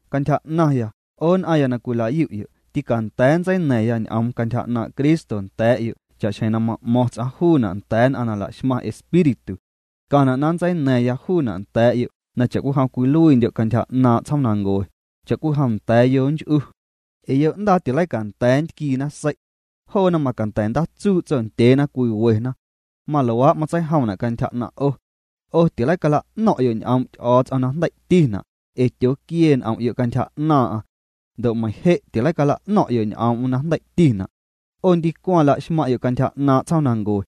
Cantyja 'naⁿya, 'o nn'aⁿya na cwila'yu'yo', tîcanda̱a̱ nntseina̱ⁿya ñ'oom cantyja 'naaⁿ' Cristo nda̱a̱'yo' cha'xjeⁿ na ma'mo̱ⁿ ts'aⁿ juuna' nda̱a̱ nn'aⁿ na la'xmaⁿ Espíritu. Tcaⁿna' na nntseina̱ⁿya juuna' nda̱a̱'yo' na cha'cwijom cwiluiindyo' cantyja 'naaⁿ' tsjoomnancue, cha'cwijom nda̱a̱ yonch'uu. Ee yo'ndaa tileicanda̱a̱ nntquiina sei'. Joona macanda̱ ndaatsuu' tsondyeena cwiwena. Maluaa' matseijomna' cantyja 'naⁿ' 'o. 'O tileicala'no̱ⁿ'yo' ñ'oom' Ty'o̱o̱ts'om na jndei'tina', ee tyooquiee n'om'yo' cantyja 'naaⁿ'aⁿ. Ndo' meiⁿ je' tileicala'no̱ⁿ'yo' ñ'oom'm na jndei'tina'. 'O ndicwaⁿ la'xmaⁿ'yo' cantyja 'naaⁿ' tsjoomnancue.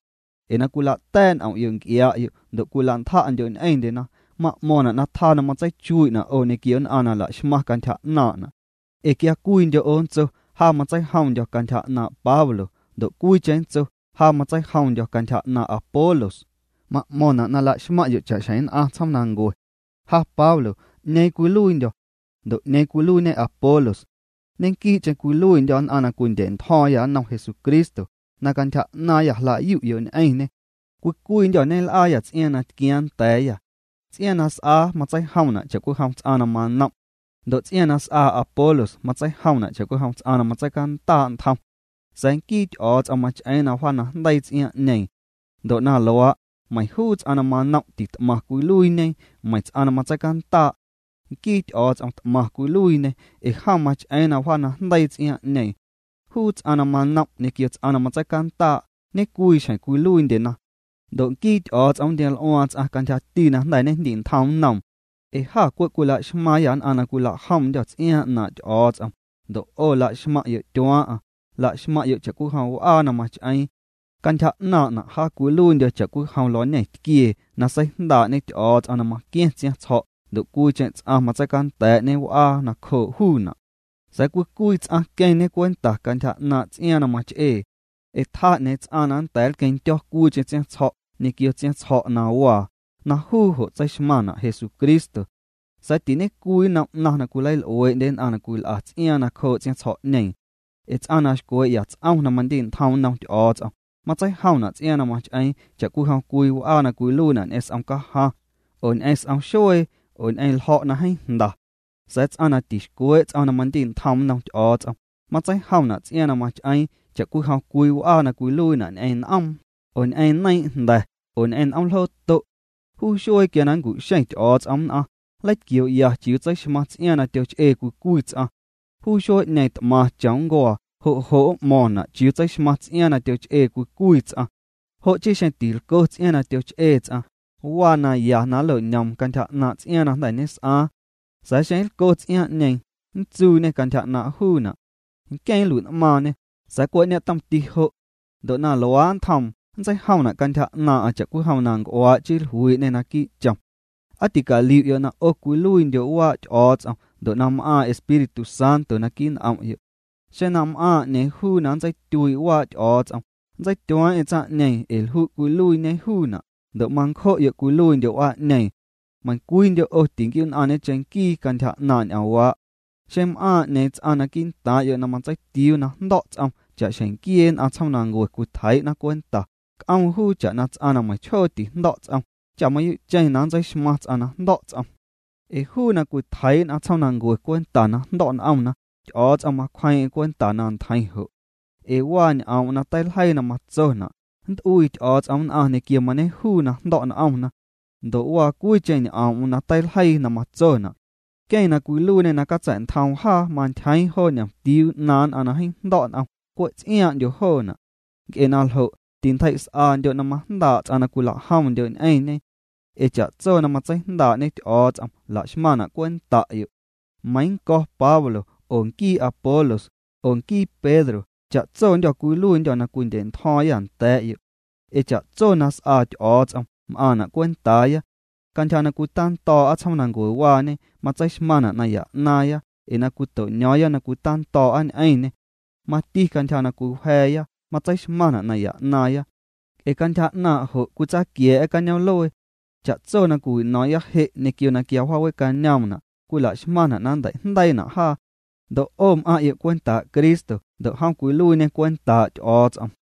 Ee na cwila'ta̱a̱' n'om'yo' nc'iaa'yo' ndo' cwila'ntja'ndyo' ñ'eⁿndyena, ma'mo̱ⁿna' na tjaa na matseichuii'na' 'o ñequio nn'aⁿ na la'xmaⁿ cantyja 'naaⁿ'na'. Ee quia cwiindyo' 'o nntso: “Ja matseijomndyo̱ cantyja 'naaⁿ' Pablo”, ndo' cwiicheⁿ nntso: “Ja matseijomndyo̱ cantyja 'naaⁿ' Apolos”, ma'mo̱ⁿna' na la'xmaⁿ'yo' cha'xjeⁿ nn'aⁿ tsjoomnancue. Ja Pablo ¿'ñeeⁿ cwiluiindyo̱? Ndo' ¿'ñeeⁿ cwiluiiñe Apolos? Ñequii'cheⁿ cwiluiindyô̱ nn'aⁿ na cwindya̱'ntjo̱o̱ⁿyâ nnom Jesucristo na cantyja 'naaⁿyâ jla'yu'yo' ñ'eⁿñê. Cwii cwiindyô̱ ñel'aayâ ts'iaaⁿ na tquiaaⁿ nda̱a̱yâ. Ts'iaaⁿ na s'aa matseijomna' cha'cwijom ts'aⁿ na manom'. Ndo' ts'iaaⁿ na s'aa Apolos matseijomna' cha'cwijom ts'aⁿ na matseicandaa' ntjom. Sa̱a̱ nquii Ty'o̱o̱ts'om mach'eeⁿ na tjaanajndeii ts'iaaⁿ'ñeeⁿ. Ndo' na luaa', meiⁿ juu ts'aⁿ na manom' tit'maⁿ cwiluiiñe, meiⁿ ts'aⁿ na matseicandaa'. Nquii Ty'o̱o̱ts'om t'maⁿ cwiluiiñê ee jom mach'eeⁿ na wjaanajndeii ts'iaaⁿ'ñeeⁿ. Juu ts'aⁿ na manom' ñequio ts'aⁿ na matseicandaa', ñe'cwii xjeⁿ cwiluiindyena. Ndo' nquii Ty'o̱o̱ts'om nntioml'uaaⁿ ts'aⁿ cantyjati na jnda̱ ñejndi'ntjom nnoom. Ee jâ cwe' cwila'xmaaⁿyâ nn'aⁿ na cwilajomndyô̱ ts'iaaⁿ 'naaⁿ' Ty'o̱o̱ts'om, ndo' 'o la'xmaⁿ'yo' tyuaaⁿ'aⁿ, la'xmaⁿ'yo' cha'cwijom w'aa na mach'eeⁿ. Cantyja 'naaⁿ'na', ja cwiluiindyo̱ cha'cwijom luañetquiee na seijndaa'ñe Ty'o̱o̱ts'om na maqua̱ⁿ tsiaⁿtsjo̱' ndo' cwiicheⁿ ts'aⁿ matseicanda̱a̱'ñe w'aa nacjoo' juuna'. Sa̱a̱ cwii cwii ts'aⁿ queⁿñe cwenta cantyja 'naaⁿ' ts'iaaⁿ na mach'ee. Ee tjaa 'ñeeⁿ ts'aⁿ na nnda̱a̱ nlqueⁿndyo̱ cwiicheⁿ ts'iaaⁿtsjo̱' ñequio tsiaⁿtsjo̱' na waa, na juu jo' tseixmaⁿna' Jesucristo. Sa̱a̱ tiñe'cwii nnom 'naⁿ na cwileil'uee'ndye nn'aⁿ na cwil'a ts'iaaⁿ nacjoo' tsiaⁿtsjo̱'ñeeⁿ. Ee ts'aⁿ na xcwee'ya ts'om na mandi'ntjom nnom Ty'o̱o̱ts'om, matseijomna' ts'iaaⁿ na mach'eeⁿ cha'cwijom cwii w'aa na cwiluiina' ñ'eⁿ s'om cajaⁿ, oo ñ'eⁿ s'om xuee, oo ñ'eⁿ ljo̱' na jeeⁿ jnda. Sa̱a̱ ts'aⁿ na tixcwee' ts'om na mandi'ntjom nnom Ty'o̱o̱ts'om, matseijomna' ts'iaaⁿ na mach'eeⁿ cha'cwijom cwii w'aa na cwiluiina' ñ'eⁿ n'oom, oo ñ'eⁿ neiiⁿ'jnda̱, oo ñ'eⁿ n'oomljooto'. Juu xuee quia na nncu'xeⁿ Ty'o̱o̱ts'om nn'aⁿ, nleitquioo'ya chiuu tseixmaⁿ ts'iaaⁿ na tyoch'ee cwii cwii ts'aⁿ. Juu xuee'ñeeⁿ t'maⁿ chom nncuaa, jo' jo' m'mo̱o̱ⁿna' chiuu tseixmaⁿ ts'iaaⁿ na tyoch'ee cwii cwii ts'aⁿ. Jo' chii xeⁿ tilco ts'iaaⁿ na tyoch'ee ts'aⁿ, waa naya na nlo'ñoom cantyja 'naaⁿ' ts'iaaⁿ na jnda̱ ñes'aaⁿ. Sa̱a̱ xeⁿ nlco ts'iaaⁿ'ñeeⁿ, nntsuuñê cantyja 'naaⁿ' juuna'. Nqueⁿ nlui'n'maaⁿñê, sa̱a̱ cwe' ñetomti jo'. Ndo' na luaa' nntjoom nntseijomna' cantyja 'naaⁿ'aⁿ cha'cwijom na nc'uaa' chii jluii'ñê naquii' chom. ¿Aa ticaliu'yo' na 'o cwiluiindyo' waa' Ty'o̱o̱ts'om ndo' na m'aaⁿ Espíritu Santo naquii' n'om'yo'? Xeⁿ na m'aaⁿ 'ñeeⁿ juu na nntseityuii' waa' Ty'o̱o̱ts'om, nntseityueeⁿ'eⁿ tsaⁿ'ñeeⁿ ee lju' cwiluiiñe juuna', ndo' mancjo'yo' cwiluiindyo' w'aa'ñeeⁿ. Meiⁿcwiindyo' 'o tinquiu'nn'aⁿñe cheⁿnquii cantyja 'naaⁿ' ñ'oomwaa'. Xeⁿ m'aaⁿ 'ñeeⁿ ts'aⁿ quii'ntaaⁿ'yo' na matseitiuu na jndo̱' ts'om cha'xjeⁿ nquiee nn'aⁿ tsjoomanancue cwitjeii'na cwenta, c'oom juu cha'na ts'aⁿ na meiⁿchjoo tijndo̱' ts'om, cha mayuu'cheⁿ nntseixmaaⁿ ts'aⁿ na jndo̱' ts'om. Ee juu na cwitjeii' nn'aⁿ tsjoomnancue cwenta na jndo̱' n'omna, Ty'o̱o̱ts'om macwjeeⁿ'eⁿ cwenta na ntjeiⁿ jo'. Ee waa ñ'oom'm na teiljeiina' na matsona': “Nnt'uii Ty'o̱o̱ts'om nn'aⁿ ñequio mañejuu na jndo̱' n'omna”. Ndo' waa cwiicheⁿ ñ'oom'm na teiljeii na matsona': “Nqueⁿ na cwiluiiñê na catsa̱'ntjoom jaa mantyjeeⁿ joo ñomtiuu 'naaⁿ nn'aⁿ na jeeⁿ jndo̱' n'om, cwe' ts'iaaⁿ'ndyo joona'.” Nc'e na ljo', tintjei's'andyo' na majndaa' ts'aⁿ na cwilajomndyo' ñ'eⁿñe. Ee cha'tso na matseijndaa'ñe Ty'o̱o̱ts'om la'xmaⁿna' cwenta'yo'. Meiiⁿ nnco̱ Pablo, oo nquii Apolos, oo nquii Pedro, cha'tsondyô̱ cwiluiindyô̱ na cwindya̱'ntjo̱o̱ⁿyâ nda̱a̱'yo'. Ee cha'tso na s'aa Ty'o̱o̱ts'om m'aaⁿna' cwentaaya. Cantyja na cwitando̱o̱'a tsjoomnancuewaañe matseixmaⁿna' naya 'naaⁿya ee na cwito'ño̱o̱ⁿya na cwitando̱o̱'a ñ'eⁿñê. Mati cantyja na cwiwja̱a̱ya matseixmaⁿna' naya 'naaⁿya, nc'e cantyja 'naaⁿ' jo' cwitsaaquia̱a̱'a cañoom'luee. Cha'tso na cwiwino̱o̱ⁿya je' ñequio na quia wjaawe'cañoomna' cwila'xmaⁿna' na nnteijndeiina' jaa. Ndo' 'o m'aⁿ'yo' cwentaa' Cristo ndo' jom cwiluiiñê cwentaa' Ty'o̱o̱ts'om.